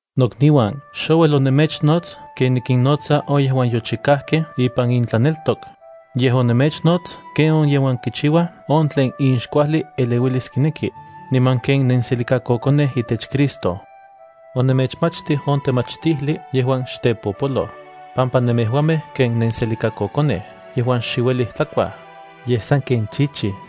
Nokniuan, xouel onemechnots ken nikinnotsa on yejuan yochikajkej ipan intlaneltok, yej onemechnots ken on yejuan kichiuaj on tlen inxkuajli eleuilis kineki, niman ken nenselikakokonej itech Cristo. Onemechmachtij on temachtijli yejuan xtepopoloj, pampa nemejuamej ken nenselikakokonej yejuan xe uelij tlakuaj, yej sanken chichij.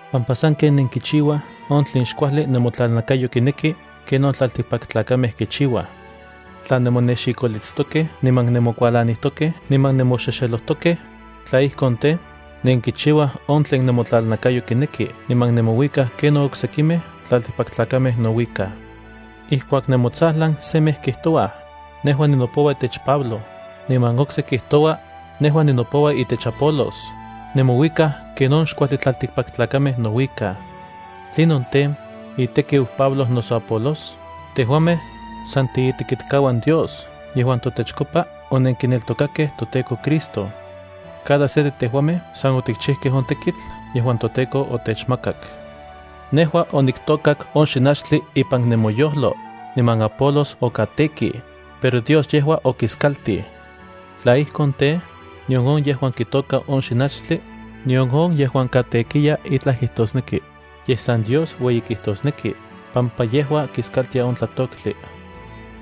pampa sanken nenkichiuaj on tlen xkuajli nemotlalnakayo kineki ken on tlaltikpaktlakamej kichiuaj. Tla nemonexikolitstokej niman nemokualanijtokej niman nemoxexelojtokej, tla ijkon tej, nenkichiuaj on tlen nemotlalnakayo kineki niman nemouikaj ken on oksekimej tlaltikpaktlakamej nouikaj. Ijkuak nemotsajlan semej kijtoua: “Nejua ninopoua itech Pablo”, niman okse kijtoua: “Nejua ninopoua itech Apolos”, nemouikaj ken on xkuajli tlaltikpaktlakamej nouikaj. ¿Tlinon tej, itekiu Pablo noso Apolos? Tejuamej, san tiitekitkauan Dios yejuan totechkopa onenkineltokakej toTEKO Cristo. Cada se de tejuamej san otikchijkej on tekitl yejuan toTEKO otechmakak. Nejua oniktôkak on xinachtli ipan nemoyojlo, niman Apolos okatekij, pero Dios yejua okiskaltij. Tla ijkon tej, nion on yejuan kitôka on xinachtli, nion on yejuan katekiya itlaj kijtosneki, yej san Dios ueyi kijtosneki, pampa yejua kiskaltia on tlatoktli.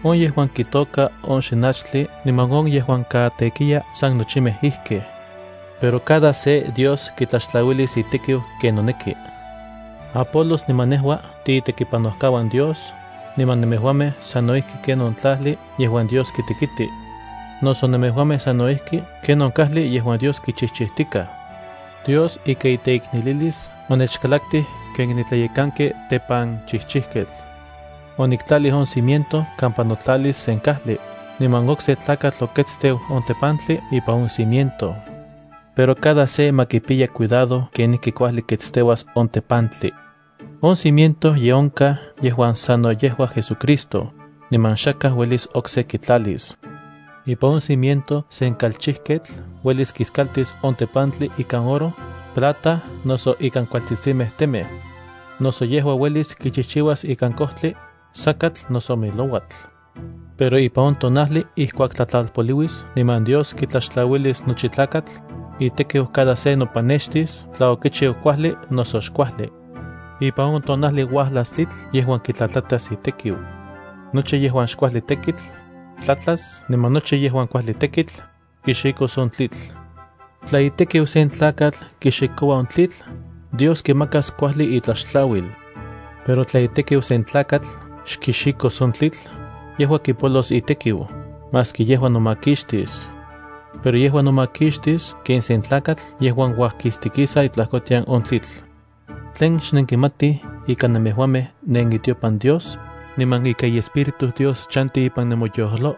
On yejuan kitôka on xinachtli niman on yejuan katekiya san nochimej ijkej. Pero Dios kitlaxtlauilis cada se ken kitocaroua ipampa itekiu. Apolos niman nejua tiitekipanojkauan Dios, niman nemejuamej sano ijki ken on tlajli yejuan Dios kitekiti. Noso nemejuamej sano ijki ken on kajli yejuan Dios kichijchijtikaj. Dios ika iteiknelilis onechkalaktij ken nitlayekanki tepanchijchijketl. Oniktlalij on cimiento kampa notlalis sen kajli, niman okse tlakatl oketsteu on tepantli ipan on cimiento. Pero cada se ma kipiya cuidado kenijki kuajli ketsteuas on tepantli. On cimiento ye onkaj yejuan sano yejua JesuCristo, niman xakaj uelis okse kitlalis. Ipan on cimiento sen kalchijketl uelis kiskaltis on tepantli ikan oro, plata noso ikan kualtsitsimej temej. Noso yejua uelis kichijchiuas ikan kojtli, sakatl noso milouatl. Pero ipan on tonajli ijkuak tlatlalpoliuis niman Dios kitlaxtlauilis nochi tlakatl, itekiu cada se nopanextis tla okichiu kuajli noso xkuajli. Ipan on tonajli uajlas tlitl yejuan kitlajtlatas itekiu. Nochi yejuan xkuajli tekitl tlatlas niman nochi yejuan kuajli tekitl kixikos on tlitl. Tla itekiu sen tlakatl kixikoua on tlitl, Dios kimakas kuajli itlaxtlauil. Pero tla itekiu sen tlakatl xkixikos on tlitl, yejua kipolos itekiu, maski yejua nomakixtis. Pero yejua nomakixtis ken sen tlakatl yejuan uajkistikisa itlajkotian on tlitl. ¿Tlen xnenkimatij ika nemejuamej nenitiopan Dios, niman ika iEspíritu Dios chanti ipan nemoyojlo?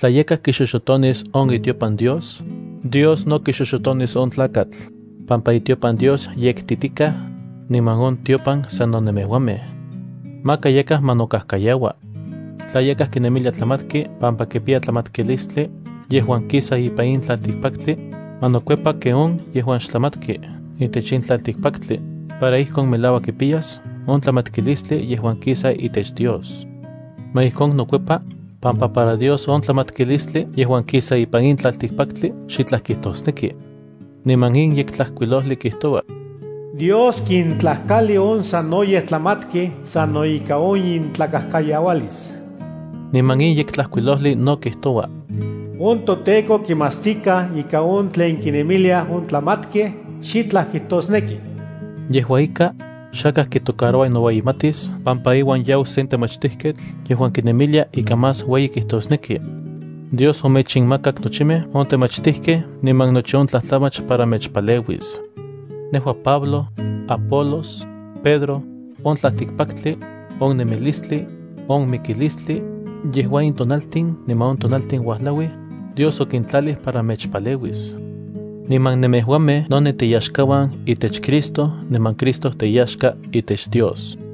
Tla yakaj kixoxotonis on itiopan Dios, Dios no kixoxotonis on tlakatl, pampa itiopan Dios yektitikaj, niman on tiopan sano nemejuamej. Maka yakaj ma nokajkayaua. Tla yakaj kinemilia tlamatki pampa kipiya tlamatkilistli, yejuan kisa ipan in tlaltikpaktli, ma nokuepa ken on yejuan xtlamatki itech in tlaltikpaktli, para ijkon melauak kipiyas on tlamatkilistli yejuan kisa itech Dios. Ma ijkon nokuepa, pampa para Dios on tlamatkilistli yejuan kisa ipan in tlaltikpaktli xitlaj kijtosneki. Niman in Yektlajkuilojli kijtoua: “Dios kintlajkali on sanoyej tlamatkej sano ika on intlakajkayaualis.” Niman in Yektlajkuilojli no kijtoua: “On toTEKO kimatstikaj ika on tlen kinemiliaj on tlamatkej xitlaj kijtosneki.” Yejua ika, xakaj kitocaroua noueyimatis pampa iuan yau sen temachtijketl yejuan kinemilia ika más ueyi kijtosneki. Dios omechinmakak nochimej on temachtijkej niman nochi on tlajtlamach para mechpaleuis. Nejua Pablo, Apolos, Pedro, on tlaltikpaktli, on nemilistli, on mikilistli, yejua in tonaltin niman on tonaltin uajlau, Dios okintlalij para mechpaleuis. Niman nemejuamej no nenteyaxkauan itech Cristo niman Cristo teyaxka itech Dios.